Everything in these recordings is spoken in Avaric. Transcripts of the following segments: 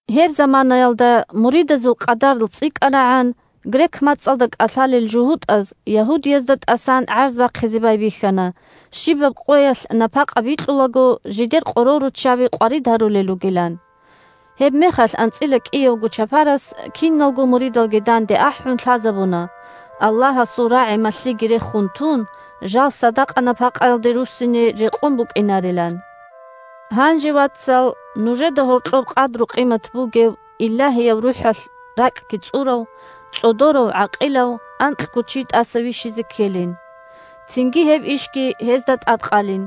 Гьеб заманаялда муридазул къадар цӀикӀкӀанагӀан, грек мацӀалда кӀалъалел жугьутӀаз ягьудиязда тӀасан гӀарз бахъизе байбихьана щибаб къоялъ напакъа бикьулаго жидер къоролруччаби къварид гьарулел ругилан. Гьебмехалъ анцӀила кӀиявго чапарас, киналго муридалги данде ахӀун, лъазабуна, Аллагьасул рагӀи-малъиги рехун тун, жал садакъа-напакъаялде руссине рекъон букӀинарилан. Гьанже, вацал, нужеда гьоркьоб къадру-къимат бугев, Илагьияб РухӀалъ ракӀги цӀурав, цӀодорав-гӀакъилав анкьго чи тӀаса вищизе ккелин. Цинги гьеб ишги гьезда тӀадкъалин,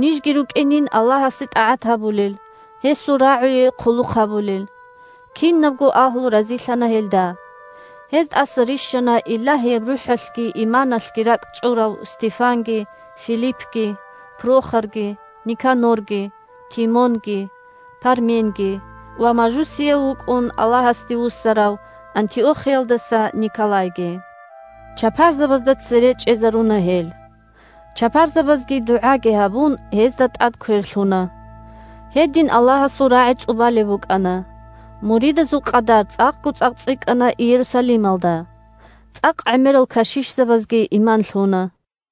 нижги рукӀинин Аллагьасе тӀагӀат гьабулел, гьесул РагӀуе хъулухъ гьабулел. Кинабго агьлу разилъана гьелда. Гьез тӀаса рищана Илагьияб РухӀалъги иманалъги ракӀ цӀурав Стефанги, Филиппги, Прохорги, Никанорги, Тимонги, Парменги ва мажусияв вукӀун Аллагьасде вуссарав Антиохиялдаса Николайги. Чапарзабазда цере чӀезаруна гьел. Чапарзабазги, дугӀаги гьабун, гьезда тӀад квер лъуна. Гьедин Аллагьасул рагӀи цӀубалеб букӀана. Муридазул къадар цӀакъго-цӀакъ цӀикӀкӀана Иерусалималда. ЦӀакъ гӀемерал кашишзабазги иман лъуна.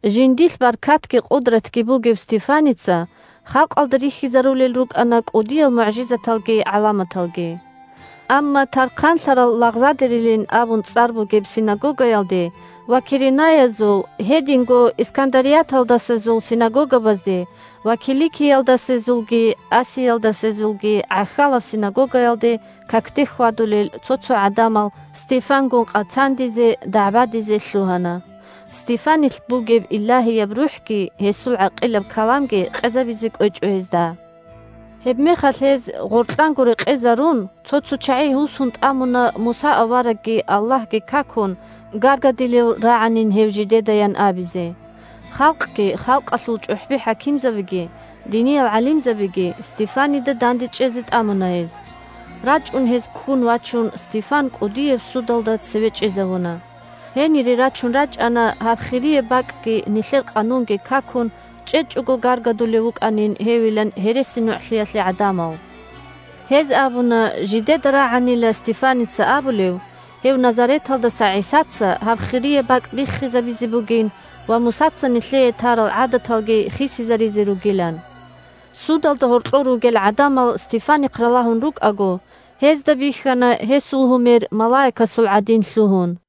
Жиндилъ баркатги къудратги бугев Стефаница халкъалда рихьизарулел рукӀана кӀудиял мугӀжизаталги гӀаламаталги. Амма «Тархъанлъарал лагъзадерилин» абун цӀар бугеб синагогаялде ва киренаязул, гьединго искандарияталдасезул синагогабазде ва киликиялдасезулги асиялдасезулги гӀахьалаб синагогаялде какде хьвадулел цо-цо гӀадамал Стефангун къацандизе, дагӀбадизе лъугьана. Стефанилъ бугеб Илагьияб РухӀги гьесул гӀакъилаб каламги къезабизе кӀвечӀо гьезда. Гьебмехалъ гьез, гъоркьанго рекъезарун, цо-цо чагӀи гьусун тӀамуна Муса аварагги Аллагьги какун гаргадилев рагӀанин гьев жидедаян абизе. Халкъги, халкъалъул чӀухӀби-хӀакимзабиги, диниял гӀалимзабиги Стефанида дандечӀезе тӀамуна гьез. РачӀун гьез ккун вачун Стефан кӀудияб судалда цеве чӀезавуна. Гьенире рачун рачӀана гьаб хирияб бакӀги Иерусалималъул Мукъадасаб Рукъ. нилъер къанунги какун чӀечӀого гаргадулев вукӀанин гьевилан гьересинугӀлъиялъе гӀадамал. Гьез абуна жидеда рагӀанила Стефаница абулеб гьев Назареталдаса ГӀисаца гьаб хирияб бакӀ биххизабизе бугин ва Мусаца нилъее тарал гӀадаталги хисизаризе ругилан. Судалда гьоркьор ругел гӀадамал Стефанихъ ралагьун рукӀаго, гьезда бихьана гьесул гьумер малаикасул гӀадин лъугьун.